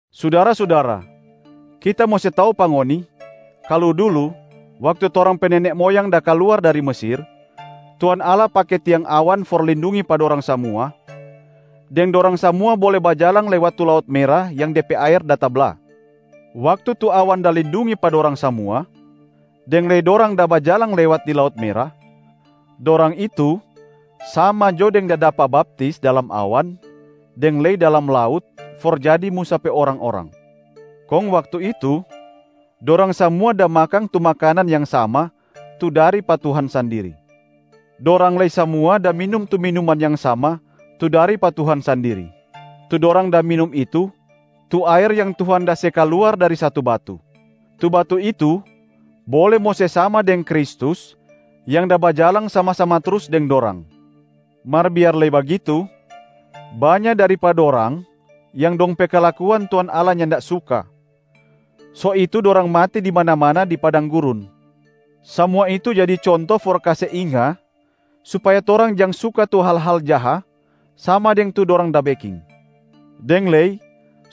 Sudara-sudara, kita mo se tau pa ngoni kalu dulu waktu torang pe nene moyang da kaluar dari Mesir, Tuhan Allah pake tiang awan for lindungi pa dorang samua, deng dorang samua bole bajalang lewat tu Laut Mera yang de pe aer da tabla. Waktu tu awan da lindungi pa dorang samua, deng lei dorang da bajalang lewat di Laut Mera, dorang itu sama jo deng da dapa baptis dalam awan deng lei dalam laut for jadi Musa pe orang-orang. Kong waktu itu, dorang samua da makang tu makanan yang sama tu dari pa Tuhan sandiri. Dorang lei samua da minum tu minuman yang sama tu dari pa Tuhan sandiri. Tu dorang da minum itu, tu aer yang Tuhan da se kaluar dari satu batu. Tu batu itu bole mo se sama deng Kristus yang da bajalang sama-sama trus deng dorang. Mar biar lei bagitu, banya dari pa dorang yang dong pe kalakuan Tuhan Allah nyanda suka, so itu dorang mati di mana-mana di padang gurun. Samua itu jadi conto for kase inga supaya torang jang suka tu hal-hal jaha sama deng tu dorang da beking, deng lei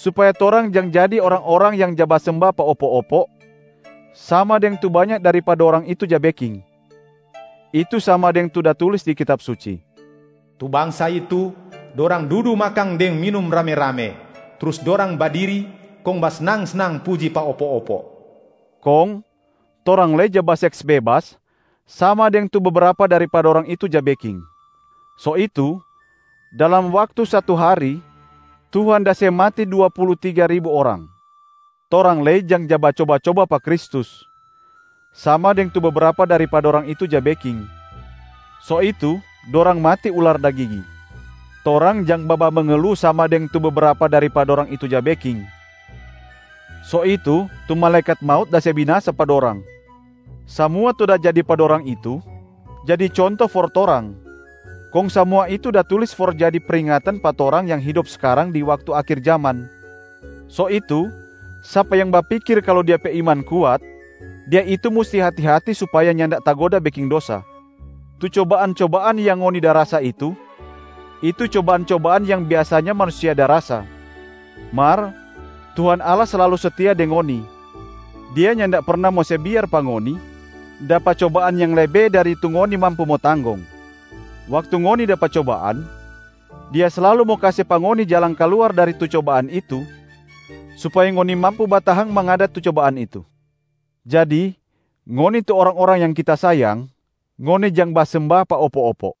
supaya torang jang jadi orang-orang yang ja basemba pa opo-opo, sama deng tu banya dari pa dorang itu ja beking. Itu sama deng tu da tulis di Kitab Suci, “Tu bangsa itu, dorang dudu makang deng minum rame-rame, trus dorang badiri kong basnang-snang puji pa opo-opo.” Kong torang lei jang baseks bebas sama deng tu bebrapa dari pa dorang itu ja beking, so itu dalam waktu satu hari Tuhan da se mati dua pulu tiga ribu orang. Torang lei jang ja bacoba-coba pa Kristus, sama deng tu bebrapa dari pa dorang itu ja beking, so itu dorang mati ular da gigi. Torang jang babamengelu sama deng tu bebrapa dari pa dorang itu ja beking, so itu tu malaekat maut da se binasa pa dorang. Samua tu da jadi pa dorang itu jadi conto for torang, kong samua itu da tulis for jadi pringatan pa torang yang hidop skarang di waktu akhir jaman. So itu sapa yang bapikir kalu dia pe iman kuat, dia itu musti hati-hati supaya nyanda tagoda beking dosa. Tu cobaan-cobaan yang ngoni da rasa itu, itu cobaan-cobaan yang biasanya manusia da rasa. Mar Tuhan Allah slalu setia deng ngoni, Dia nyanda perna mo se biar pa ngoni dapa cobaan yang lebe dari tu ngoni mampu mo tanggong. Waktu ngoni dapa cobaan, Dia slalu mo kase pa ngoni jalang kaluar dari tu cobaan itu, supaya ngoni mampu batahang mangada tu cobaan itu. Jadi ngoni tu orang-orang yang kita sayang, ngoni jang basemba pa opo-opo.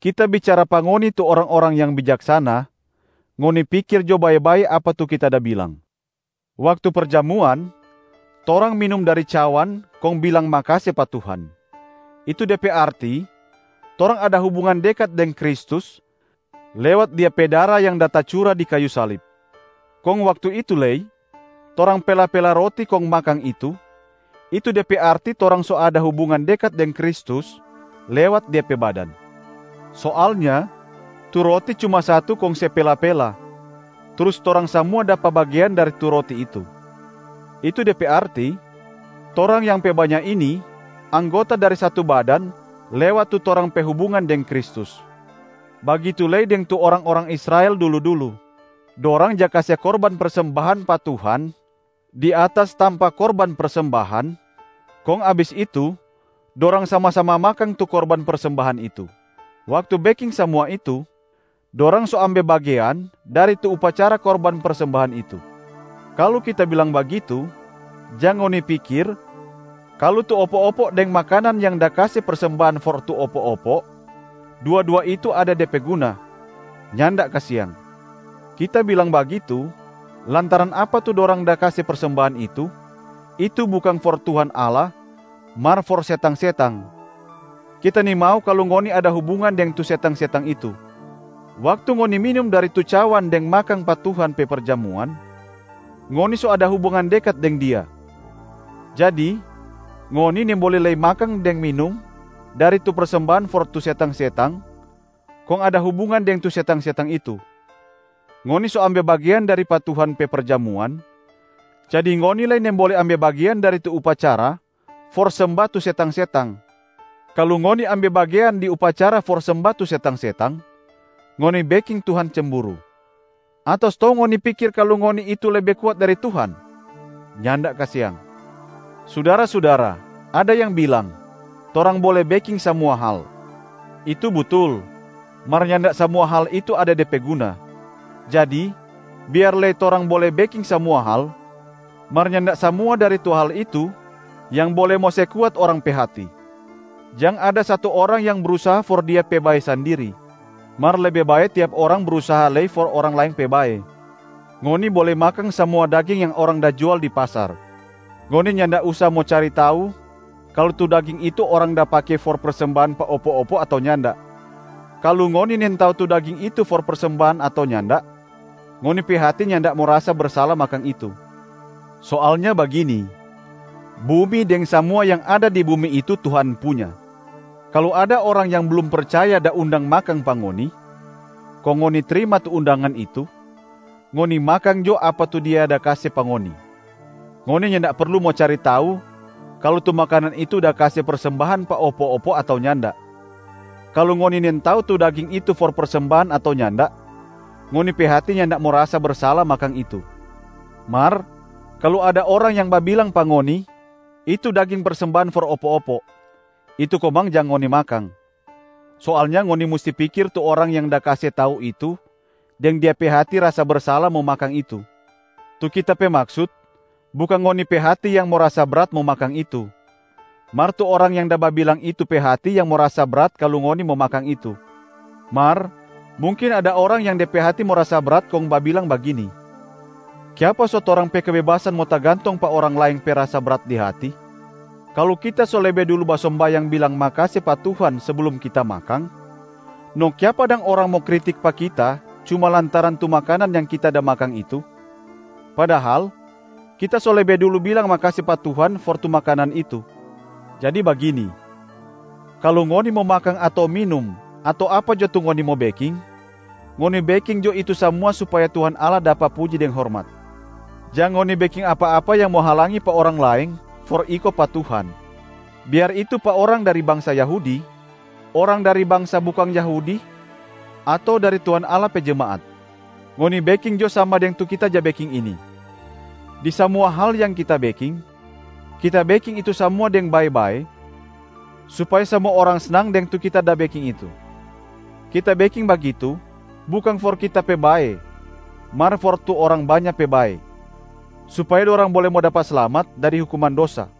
Kita bicara pa ngoni tu orang-orang yang bijaksana, ngoni pikir jo bae-bae apa tu kita da bilang. Waktu perjamuan, torang minum dari cawan kong bilang makase pa Tuhan, itu de pe arti torang ada hubungan dekat deng Kristus lewat Dia pe dara yang da tacura di kayu salib. Kong waktu itu lei, torang pela-pela roti kong makang itu, itu de pe arti torang so ada hubungan dekat deng Kristus lewat Dia pe badan. Soalnya tu roti cuma satu kong se pela-pela, trus torang samua dapa bagean dari tu roti itu. Itu de pe arti, torang yang pe banya ini anggota dari satu badan lewat tu torang pe hubungan deng Kristus. Bagitu lei deng tu orang-orang Israel dulu-dulu, dorang ja kase korban persembahan pa Tuhan di atas tampa korban persembahan, kong abis itu dorang sama-sama makang tu korban persembahan itu. Waktu beking samua itu, dorang so ambe bagean dari tu upacara korban persembahan itu. Kalu kita bilang bagitu, jang ngoni pikir kalu tu opo-opo deng makanan yang da kase persembahan for tu opo-opo, dua-dua itu ada de pe guna. Nyanda kasiang. Kita bilang bagitu lantaran apa tu dorang da kase persembahan itu, itu bukang for Tuhan Allah mar for setang-setang. Kita nimau kalu ngoni ada hubungan deng tu setang-setang itu. Waktu ngoni minum dari tu cawan deng makang pa Tuhan pe perjamuan, ngoni so ada hubungan dekat deng Dia. Jadi ngoni nimbole lei makang deng minum dari tu persembahan for tu setang-setang kong ada hubungan deng tu setang-setang itu. Ngoni so ambe bagean dari pa Tuhan pe perjamuan, jadi ngoni lei nimbole ambe bagean dari tu upacara for semba tu setang-setang. Kalu ngoni ambe bagean di upacara for semba tu setang-setang, ngoni beking Tuhan cemburu. Ato stou ngoni pikir kalu ngoni itu lebe kuat dari Tuhan? Nyanda kasiang. Sudara-sudara, ada yang bilang, “Torang bole beking samua hal.” Itu butul, mar nyanda samua hal itu ada de pe guna. Jadi biar lei “torang bole beking samua hal,” mar nyanda samua dari tu hal itu yang bole mo se kuat orang pe hati. Jang ada satu orang yang brusaha for dia pe bae sandiri, mar lebe bae tiap orang brusaha lei for orang laeng pe bae. Ngoni bole makang samua daging yang orang da jual di pasar. Ngoni nyanda usa mo cari tau kalu tu daging itu orang da pake for persembahan pa opo-opo ato nyanda. Kalu ngoni nintau tu daging itu for persembahan ato nyanda, ngoni pe hati nyanda mo rasa bersala makang itu. Soalnya bagini, “Bumi deng samua yang ada di bumi itu Tuhan punya.” Kalu ada orang yang blum percaya da undang makang pa ngoni, kong ngoni trima tu undangan itu, ngoni makang jo apa tu dia da kase pa ngoni. Ngoni nyanda perlu mo cari tau kalu tu makanan itu da kase persembahan pa opo-opo ato nyanda. Kalu ngoni nintau tu daging itu for persembahan ato nyanda, ngoni pe hati nyanda mo rasa bersala makang itu. Mar kalu ada orang yang babilang pa ngoni, “Itu daging persembahan for opo-opo,” itu komang jang ngoni makang. Soalnya ngoni musti pikir tu orang yang da kase tau itu deng dia pe hati rasa bersala mo makang itu. Tu kita pe maksut bukang ngoni pe hati yang mo rasa brat mo makang itu, mar tu orang yang da babilang itu pe hati yang mo rasa brat kalu ngoni mo makang itu. Mar mungkin ada orang yang de pe hati mo rasa brat kong babilang bagini, “Kiapa so torang pe kebebasan mo tagantong pa orang laeng pe rasa brat di hati? Kalu kita so lebe dulu basombayang bilang makase pa Tuhan seblum kita makang, no kiapa dang orang mo kritik pa kita cuma lantaran tu makanan yang kita da makang itu? Padahal, kita so lebe dulu bilang makase pa Tuhan for tu makanan itu.” Jadi bagini: kalu ngoni mo makang ato minum ato apa jo tu ngoni mo beking, ngoni beking jo itu samua supaya Tuhan Allah dapa puji deng hormat. Jang ngoni beking apa-apa yang mo halangi pa orang laeng for iko pa Tuhan, biar itu pa orang dari bangsa Yahudi, orang dari bangsa bukang Yahudi ato dari Tuhan Allah pe jemaat. Ngoni beking jo sama deng tu kita ja beking ini: di samua hal yang kita beking, kita beking itu samua deng bae-bae supaya samua orang snang deng tu kita da beking itu. Kita beking bagitu bukang for kita pe bae mar for tu orang banya pe bae, supaya dorang bole mo dapa slamat dari hukuman dosa.